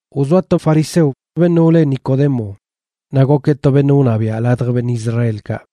Wzoa to fariseo beṉꞌ wle Nicodemo, naꞌ gokeꞌ to beṉꞌ wṉabiaꞌ ladj beṉꞌ Israelkaꞌ.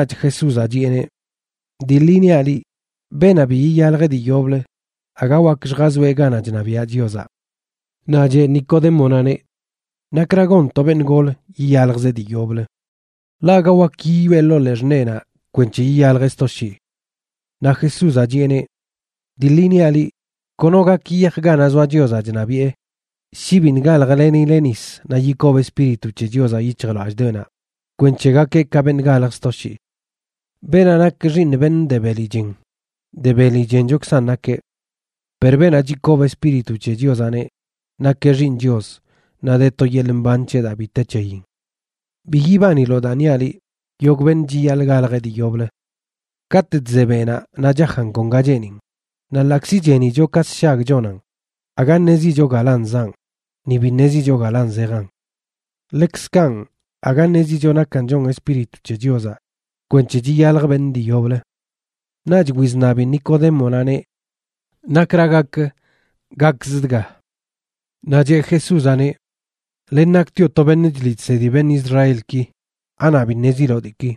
Naꞌch Jesúzaꞌ chiꞌeneꞌ: ―Dii ḻi niaꞌ liꞌ, beenaꞌ bi yiyalj dii yoblə aga wak lljazoeꞌ ganaꞌ chṉabiaꞌ Chiozaꞌ. Naꞌ cheꞌ Nicodémonaꞌneꞌ: ―¿Nakra gon to beṉꞌ gol yiyaljzeꞌ dii yoblə? Ḻaꞌ aga wak yiyoꞌe ḻoo ḻee xṉeenaꞌ kwenc̱he yiyaljeꞌ sto shii. Naꞌ Jesúzaꞌ chiꞌeneꞌ: ―Dii ḻi niaꞌ liꞌ, kono gak yiyaj ganaꞌ zoa Chiozaꞌ chṉabiꞌe shi biṉꞌ galjlenileꞌ nisa naꞌ yikob Espíritu c̱he Chiozaꞌ yic̱hjlallꞌdoꞌenaꞌ kwenc̱he gakeꞌ ka beṉꞌ galj sto shii. Beenaꞌ nak xiiṉ beṉꞌ de beli chen, de beli chenchokzan nakeꞌ. Per beenaꞌ chikob Espíritu c̱he Chiozaꞌneꞌ, nakeꞌ xiiṉ Chios naꞌ de to yeḻꞌ mban c̱heꞌ daa bi te c̱heyin. Bi yibaniloꞌ daa niaꞌ liꞌ: “Yogꞌ beṉꞌ chiyaḻꞌ galjeꞌ dii yoblə.” Katꞌ chze beꞌnaꞌ naꞌ chajan kon ga cheenin, naꞌ ḻaꞌkzi chenicho ka sshag chonan aga ṉezicho galan zaꞌn, ni bi ṉezicho galan zejan. Ḻekzkanꞌ aga ṉezicho nakan chon Espíritu c̱he Chiozaꞌ kwenc̱he chiyalj beṉꞌ dii yoblə. Naꞌch wizṉabi Nicodémonaꞌneꞌ: ―¿Nakra gak gakz dga? Naꞌ cheꞌ Jesúzaꞌneꞌ: ―Len naktioꞌ to beṉꞌ chliꞌ chsedi beṉꞌ Israelki, ¿anaꞌ bi ṉeziloꞌ diiki?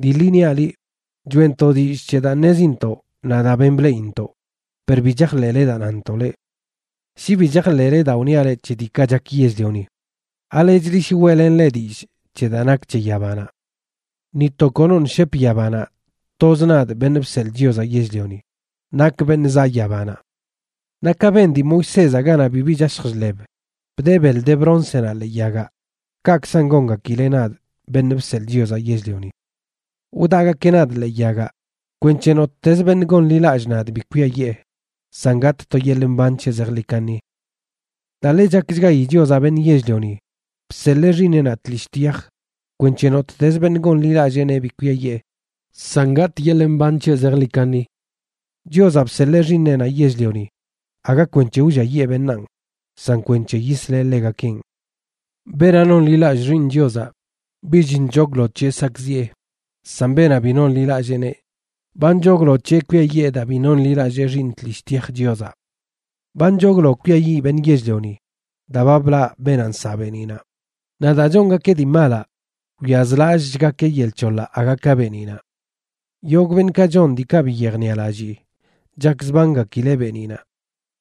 Dii ḻi niaꞌ liꞌ, choeꞌntoꞌ dillꞌ c̱he daa ṉezintoꞌ naꞌ daa ben bleꞌintoꞌ, per bi chajḻeꞌle daa nantoꞌ leꞌ. Shi bi chajḻeꞌle daa wniaꞌ leꞌ c̱he diikaꞌ chak yell-lioni, ¿alechlə shi weꞌlenꞌ leꞌ dillꞌ c̱he daa nak c̱he yabanaꞌ? ’Ni to konoṉꞌ shep yabanaꞌ, toz nadꞌ, Beṉꞌ Bseḻꞌ Chiozaꞌ Yell-lioni, nakꞌ beṉꞌ zaꞌ yabanaꞌ. Naꞌ ka ben dii Moisézaꞌ ganaꞌ bibi chashj chḻeb bdee beḻ de broncenaꞌ ḻee yagaꞌ, kaꞌkzan gongakileꞌ nadꞌ, Beṉꞌ Bseḻꞌ Chiozaꞌ Yell-lioni. Wdaꞌgakeꞌ nadꞌ ḻee yagaꞌ kwenc̱he nottez beṉꞌ gonḻilallꞌ nadꞌ bi kwiayee, san gatꞌ to yeḻꞌ mban c̱heꞌ zejḻi kaṉi. ’Daa ḻe chakchgayi Chiozaꞌ beṉꞌ yell-lioni, bseḻee Xiiṉeꞌnaꞌ tlishꞌ tyaj kwenc̱he nottez beṉꞌ gonḻilalleeneꞌ bi kwiayee, san gatꞌ yeḻꞌ mban c̱heꞌ zejḻi kaṉi. Chiozaꞌ bseḻee xiiṉeꞌnaꞌ yell-lioni aga kwenc̱he wlliayee beṉaan, san kwenc̱he yisleꞌ ḻegakenꞌ. ’Beenaꞌ nonḻilallꞌ Xiiṉ Chiozaꞌ, bich nchoglo c̱heꞌ sakꞌziꞌe, san beenaꞌ bi nonḻilalleeneꞌ, ba nchoglo c̱heꞌ kwiayee daa bi nonḻilallee Xiiṉ tlishꞌ tyaj Chiozaꞌ. Ba nchoglo kwiayiꞌ beṉꞌ yell-lioni daa ba blaꞌ beenaꞌ nsaꞌ beeniꞌnaꞌ, naꞌ daa chongakeꞌ dii malaꞌ, wyazlallꞌchgakeꞌ yel c̱hoḻaꞌ aga ka beeniꞌnaꞌ. Yogꞌ beṉꞌkaꞌ chon diikaꞌ bi yejniꞌalallii chakzbangakileꞌ beeniꞌnaꞌ,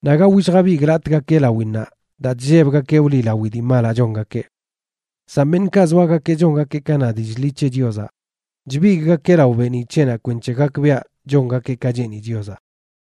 naꞌ aga willjabigꞌlatꞌgakeꞌ lawinnaꞌ daa chllebgakeꞌ wliꞌlawi dii malaꞌ chongakeꞌ. San beṉꞌkaꞌ zoagakeꞌ chongakeꞌ ka na dillꞌ ḻi c̱he Chiozaꞌ, chbigꞌgakeꞌ lao beeniꞌ c̱heꞌnaꞌ kwenc̱he gakbiaꞌ chongakeꞌ ka cheeni Chiozaꞌ.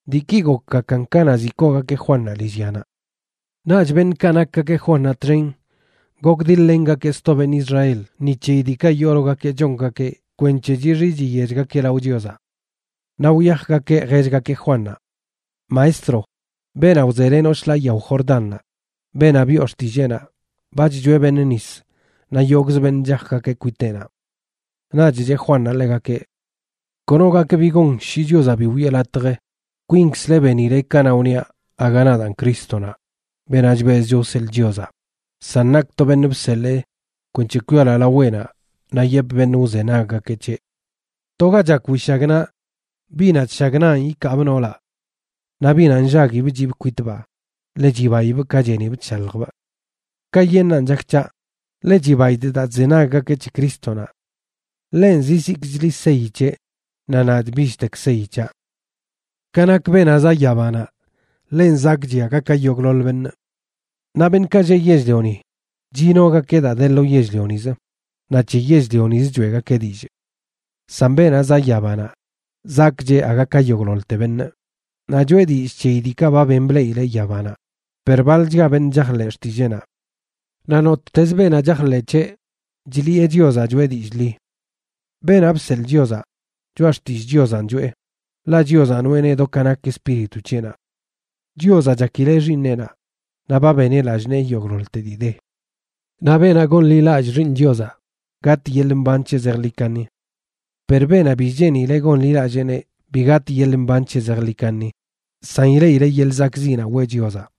Diiki gokgakan kanaꞌ ziꞌ koogakeꞌ Juannaꞌ lillyanaꞌ. Naꞌch beṉꞌkaꞌ nakgakeꞌ Juannaꞌ txen gokdiḻ-lengakeꞌ sto beṉꞌ Israel ni c̱heyi diikaꞌ yoologakeꞌ chongakeꞌ kwenc̱he chixi chiyechgakeꞌ lao Chiozaꞌ. Naꞌ wyajgakeꞌ jellgakeꞌ Juannaꞌ: ―Maestro, beenaꞌ wzelenoꞌ shḻaa yao Jordannaꞌ, beenaꞌ biꞌo xtilleenaꞌ, ba chchoeꞌ beṉꞌ nis naꞌ yogꞌzə beṉꞌ chajgakeꞌ kwiteꞌnaꞌ. Naꞌch cheꞌ Juannaꞌ ḻegakeꞌ: ―Kono gak bi gon shi Chiozaꞌ bi wiꞌe latj. Kwinkzle benile kanaꞌ wniaꞌ aga nadaan Crístonaꞌ, beenaꞌ chbezcho wseḻꞌ Chiozaꞌ, san nakꞌ to beṉꞌ bseḻee kwenc̱he kwialoaꞌ laweꞌnaꞌ naꞌ yepꞌ beṉꞌ wzenaggakeꞌ c̱heꞌ. To ga chak wishagnaꞌ, biꞌnaꞌ chshagnanꞌ ikaabꞌ noolaꞌ. Naꞌ biꞌnaꞌ nllaguibꞌ chiꞌbꞌ kwitbaa, ḻe chibaibꞌ ka chenibꞌ chshaljbꞌ. Kayeṉꞌnan chak c̱haꞌ, ḻe chibaidꞌ daa chzenaggakeꞌ c̱he Crístonaꞌ. Ḻenꞌ zizikchli seyi c̱heꞌ, naꞌ nadꞌ bichtek seyi c̱haꞌ. ’Ka nak beenaꞌ zaꞌ yabanaꞌ, ḻenꞌ zakꞌchiꞌ aga ka yogꞌḻoḻ beṉꞌ. Naꞌ beṉꞌkaꞌ lleꞌ yell-lioni, chinogakeꞌ daa de lo yell-lionizə, naꞌ c̱he yell-lionizə choeꞌgakeꞌ dillꞌ. San beenaꞌ zaꞌ yabanaꞌ zakꞌcheꞌ aga ka yogꞌḻoḻte beṉꞌ, naꞌ choeꞌ dillꞌ c̱heyi diikaꞌ ba ben bleꞌileꞌ yabanaꞌ, per baḻchga beṉꞌ chajḻeꞌ xtilleenaꞌ. Naꞌ nottez beenaꞌ chajḻeꞌ c̱heꞌ, chliꞌe Chiozaꞌ choꞌe dillꞌ ḻi. Beenaꞌ bseḻꞌ Chiozaꞌ, choꞌa xtillꞌ Chiozanꞌ choꞌe, ḻaꞌ Chiozaꞌ noꞌeneꞌ do ka nak Espíritu c̱heꞌnaꞌ. Chiozaꞌ chakileꞌ Xiiṉeꞌnaꞌ, naꞌ ba beneꞌ lallꞌ nee yogꞌḻoḻte dii de. Naꞌ beenaꞌ gonḻilallꞌ Xiiṉ Chiozaꞌ gatꞌ yeḻꞌ mban c̱heꞌ zejḻi kaṉi. Per beenaꞌ bi cheeni gonḻilalleeneꞌ bi gatꞌ yeḻꞌ mban c̱heꞌ zejḻi kaṉi, san ileꞌileꞌ yeḻꞌ zakꞌziꞌnaꞌ weꞌ Chiozaꞌ.